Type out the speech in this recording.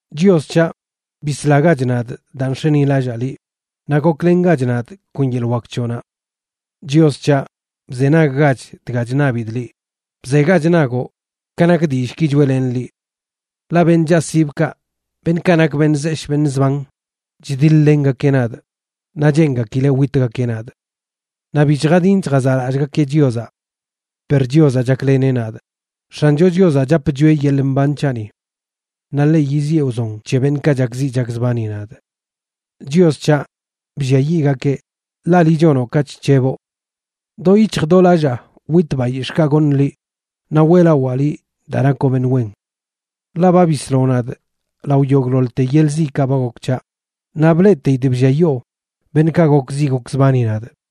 Chios c̱haꞌ, bislagach nadꞌ daa nx̱enilallaa liꞌ, naꞌ goklengach nadꞌ kon yeḻꞌ wak c̱hoꞌnaꞌ. Chios c̱haꞌ, bzenaggach dga chṉabidꞌ liꞌ, bzegach nagoꞌ ka nak dillꞌki choeꞌlenꞌ liꞌ. Ḻaꞌ beṉꞌ chaꞌsibkaꞌ, beṉꞌkaꞌ nak beṉꞌ zeshꞌ beṉꞌ zban, chdiḻ-lengakeꞌ nadꞌ naꞌ cheengakileꞌ witgakeꞌ nadꞌ. Naꞌ bi chjadin chjazaꞌlallꞌgakeꞌ Chiozaꞌ. Per Chiozaꞌ chakleneꞌ nadꞌ; X̱ancho Chiozaꞌ chap chwieꞌ yeḻꞌ mban c̱haꞌni. Naꞌ ḻeꞌ yiziꞌe wzon c̱he beṉꞌkaꞌ chakziꞌ chakzbani nadꞌ. ¡Chios c̱haꞌ, blliayiꞌgakeꞌ, ḻaꞌ liꞌ chonoꞌ ka chc̱heboꞌ! Do yic̱hj do lallaa witꞌ bayix̱ꞌkaꞌ goṉꞌ liꞌ, naꞌ weꞌlawaa liꞌ daa nakoꞌ beṉꞌ wen. Ḻaꞌ ba bisloꞌ nadꞌ lao yogꞌḻoḻte yeḻꞌ ziꞌkaꞌ ba gok c̱haꞌ, naꞌ bleꞌteidꞌ blliayoo beṉꞌkaꞌ gokziꞌ gokzbani nadꞌ.